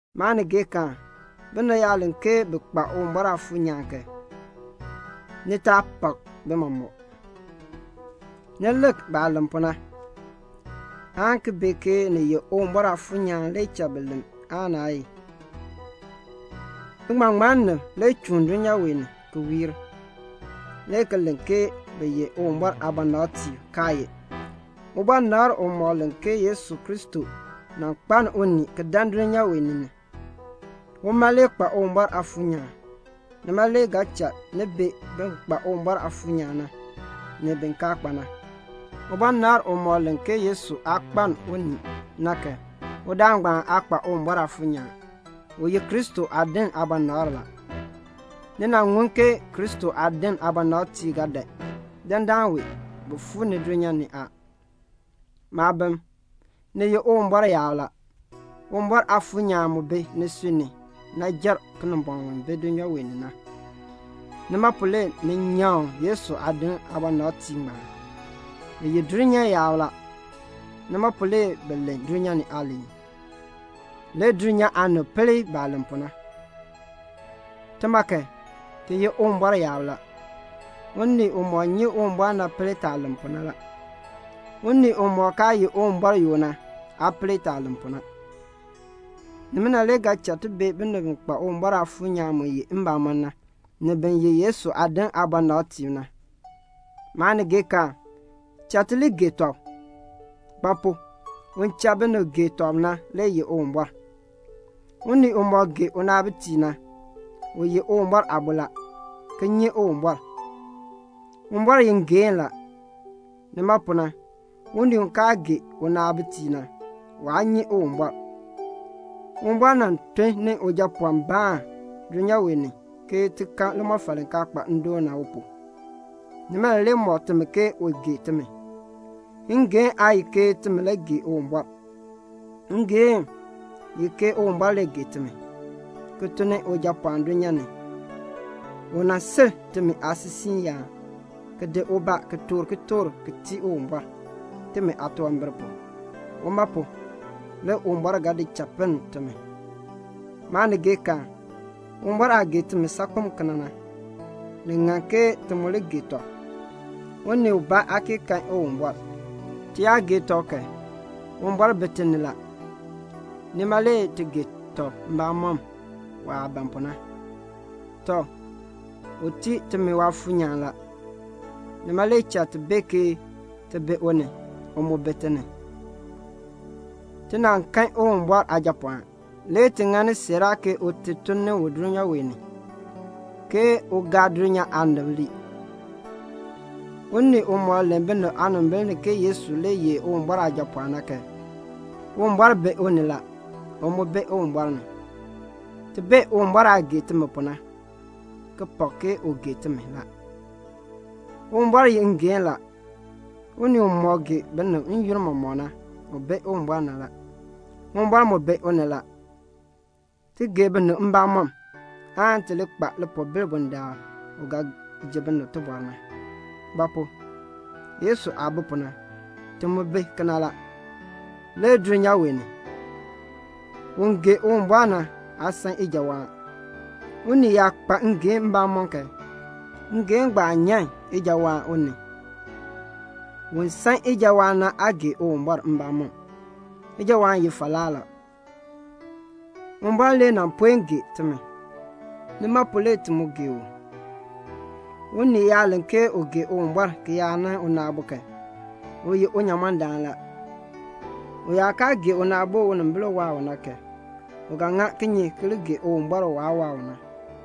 Maanigeekaan, binib yaa len ke bi kpa Uwumbɔr Aafuur nyaan kan, ni taa pak bi mɔmɔk. Ni lik baah len pu na, aan ki bee ke ni ye Uwumbɔr Aafuur nyaan le cha bi len aan naa ye. Biŋmaŋmannim le chuun dulnyaa wee ni ki wiir, le ki len ke bi ye Uwumbɔr aabɔnabtiib, kaa ye. Ubɔnabr umɔk len ke Yesu Kristo nan kpaln unii ki dan dulnyaa wee ni na, uma le kpa Uwumbɔr Aafuur nyaan. Nima le ga cha ni bee bin kpa Uwumbɔr Aafuur nyaan na, ni bin kaa kpa na. Ubɔnabr umɔk len ke Yesu aa kpaln unii na kan, udaan ngbaan aa kpa Uwumbɔr Aafuur nyaan. U ye Kristo aadin aabɔnabr la. Ni nan ŋun ke Kristo aadin aabɔnabtiib ga dan. Dandana wee, bi fuu ni dulnyaa ni a. Maabim, ni ye Uwumbɔr yaab la. Uwumbɔr Aafuur nyaan mu bi nisui ni na jer Kinimbɔŋ u bi dulnyaa wee ni na. Nima pu le ni nyaŋ Yesu aadin aabɔnabtiib ngbaan. Bi ye dulnyaa yaab la. Nima pu le bi len dulnyaa aaliin, le dulnyaa aanib pel baah len pu na. Tima kan, ti ye Uwumbɔr yaab la. Unii umɔk nyi Uwumbɔr na pel taah len pu na la. Unii umɔk kaa ye Uwumbɔr yoo na aa pel taah len pu na. Nimina le ga cha ti bee binib bi kpa Uwumbɔr Aafuur nyaan mu ye mbamɔn na, ni bin ye Yesu aadin aabɔnabtiib na. Maanigeekaan, cha ti li gee tɔb. Ba pu? un cha binib gee tɔb na le ye Uwumbɔr. Unii umɔk gee unaabitiib na, u ye Uwumbɔr aabo la, ki nyi Uwumbɔr. Uwumbɔr ye ngeehn la. Nima pu na, unii u kaa gee unaabitiib na, waa nyi Uwumbɔr. Uwumbɔr nan tun ni Ujapɔɔnbaan dulnyaa wee ni ke ti kan limɔfal li kaa kpa ndoon na u pu. Nimina le mɔk timi ke u gee timi. Ngeehn aa ye ke timi le gee Uwumbɔr. Ngeehn ye ke Uwumbɔr le gee timi, ki tun ni Ujapɔɔn dulnyaa ni, u nan si timi aasisiiyaan ki di ubaa ki toor kitork ki tii Uwumbɔr, timi aatunwambir pu. Uma pu, le Uwumbɔr ga di cha pinn timi. Maanigeekaan, Uwumbɔr aah gee timi saakpen kena na, ni ŋan ke ti mu li gee tɔb. Unii ubaa aa kee kan Uwumbɔr. Ti yaa gee tɔb kan, Uwumbɔr bi ti ni la, nima le ti gee tɔb mbamɔm waah ban pu na. Tɔ, u tii timi Waafuur nyaan la. Nima le cha ti bee ke ti bi u ni, u mu bi ti ni. Ti nan kan Uwumbɔr Aajapɔɔn; le ti ŋani siiraa ke Ute tun ni u dulnyaa wee ni, aan dulnyaa aanib ŋmar. Unii umɔk len binib aanimbil ni ke Yesu le ye Uwumbɔr Aajapɔɔn na kan, Uwumbɔr bi u ni la, u mu bi Uwumbɔr ni. Ti bee Uwumbɔr aah gee timi pu na, ki pak ke u gee timi la. Uwumbɔr ye ngeehn la. Unii umɔk gee binib n-yoonn mɔmɔk na, u bi Uwumbɔr ni la, Uwumbɔr mu bi u ni la. Ti gee binib mbamɔm, aan ti li kpa lipoobil bundaln Uwumbɔr ga ji binib tibɔr na. Ba pu? Yesu aah bi pu na, ti mu bi kena la, le dulnyaa wee ni. Un gee Uwumbɔr na aa san ijawaan. Unii yaa kpa ngeehn mbamɔm kan, ngeehn ngbaan nyan ijawaan u ni. Un san ijawaan na aa gee Uwumbɔr mbamɔm; ijawaan ye falaa la. Uwumbɔr le nan puen gee timi. Nima pu le ti mu gee u. Unii yaa len ke u gee Uwumbɔr ki yaa nan una aabo kan, u ye unyamɔndaan la. U yaa kaa gee una aabo u unimbil waa u na kan, u ga ŋa kinye ki li gee Uwumbɔr u waah kaa waa u na?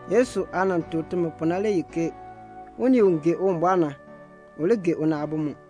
Yesu aah nan tuk timi pu na le ye ke: unii u gee Uwumbɔr na, u li gee una aabo mu.